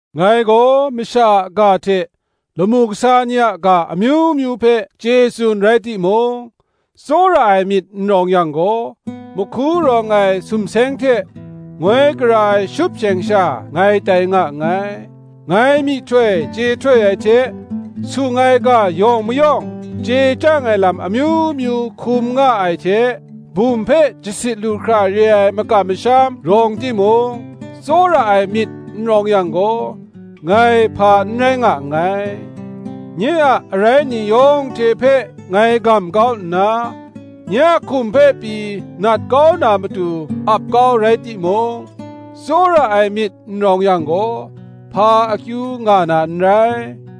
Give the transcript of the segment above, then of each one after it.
Ngai gaw masha a ga hte lamu kasa ni a ga amyu myu hpe chye tsun rai timung, tsawra ai myit n rawng yang gaw, mahku rawng ai sumseng hte, ngoi gara ai shupsheng sha ngai tai nga nngai. Ngai myihtoi chye htoi ai hte, sung ai ga yawng mayawng, chye chyang ai lam amyu myu hkum nga ai hte, bum hpe jasit lu hkra re ai makam masham rawng timung, tsawra ai myit n rawng yang gaw, ngai hpa n rai nga nngai. Nye a arai ni yawng hte hpe ngai gam kau nna, nye a hkum hpe pyi nat kau na matu ap kau rai timung, tsawra ai myit n rawng yang gaw; hpa akyu nga na n rai.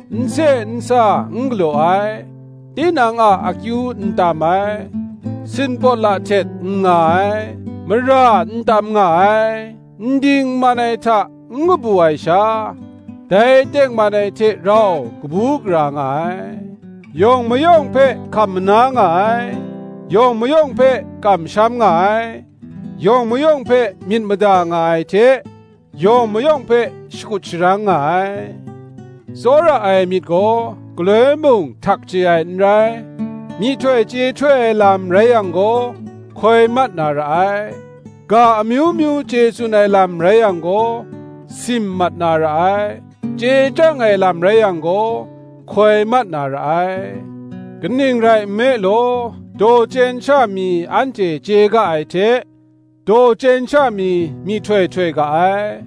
n se n sa n galaw ai, tinang a akyu n tam ai, sin pawt la htet n nga ai, mara n tam nga ai, n ding n man ai hta n kabu ai sha, dai tengman ai hte rau kabu gara nga ai: yawng mayawng hpe hkam mana nga ai, yawng mayawng hpe kamsham nga ai, yawng mayawng hpe myit mada nga ai hte yawng mayawng hpe shakut sharang nga ai. Tsawra ai myit gaw galoi mung htak chye ai n rai: myihtoi chye htoi ai lam rai yang gaw, hkoi mat na ra ai: ga amyu myu chye tsun ai lam rai yang gaw, sim mat na ra ai; chye chyang ai lam rai yang gaw, hkoi mat na ra ai. Kaning rai nme law, daw chyen sha mi anhte chye ga ai hte, daw chyen sha mi myihtoi htoi ga ai: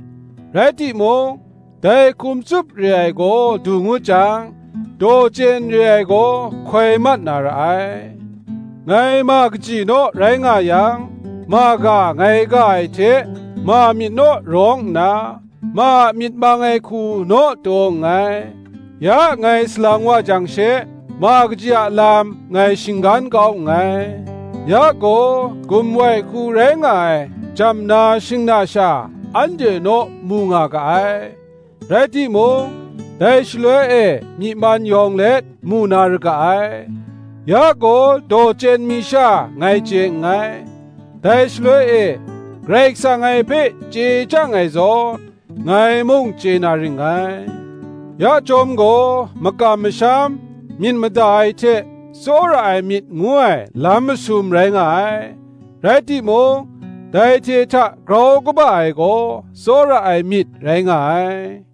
rai timung, dai hkum tsup re ai gaw du ngut jang, daw chyen re ai gaw hkoi mat na ra ai. Ngai ma kaji naw rai nga yang, ma ga ngai ga ai hte ma myit naw rawng nna, ma a myit mang ai hku naw taw nngai; ya ngai salang wa jang she, ma kaji a lam ngai shinggan kau nngai. Ya gaw gumwai hku rai nga ai jamna shingna sha anhte naw mu nga ga ai; rai timung, dai shaloi e myi man yawng let mu na ra ga ai: ya gaw daw chyen mi sha ngai chye nngai; dai shaloi e, Karai Kasang ngai hpe chye chyang ai zawn, ngai mung chye na ring ngai. Ya chyawm gaw, makam masham, myit mada ai hte tsawra ai myit ngu ai lam masum rai nga ai, rai timung, dai hte hta grau kaba ai gaw tsawra ai myit rai nga ai.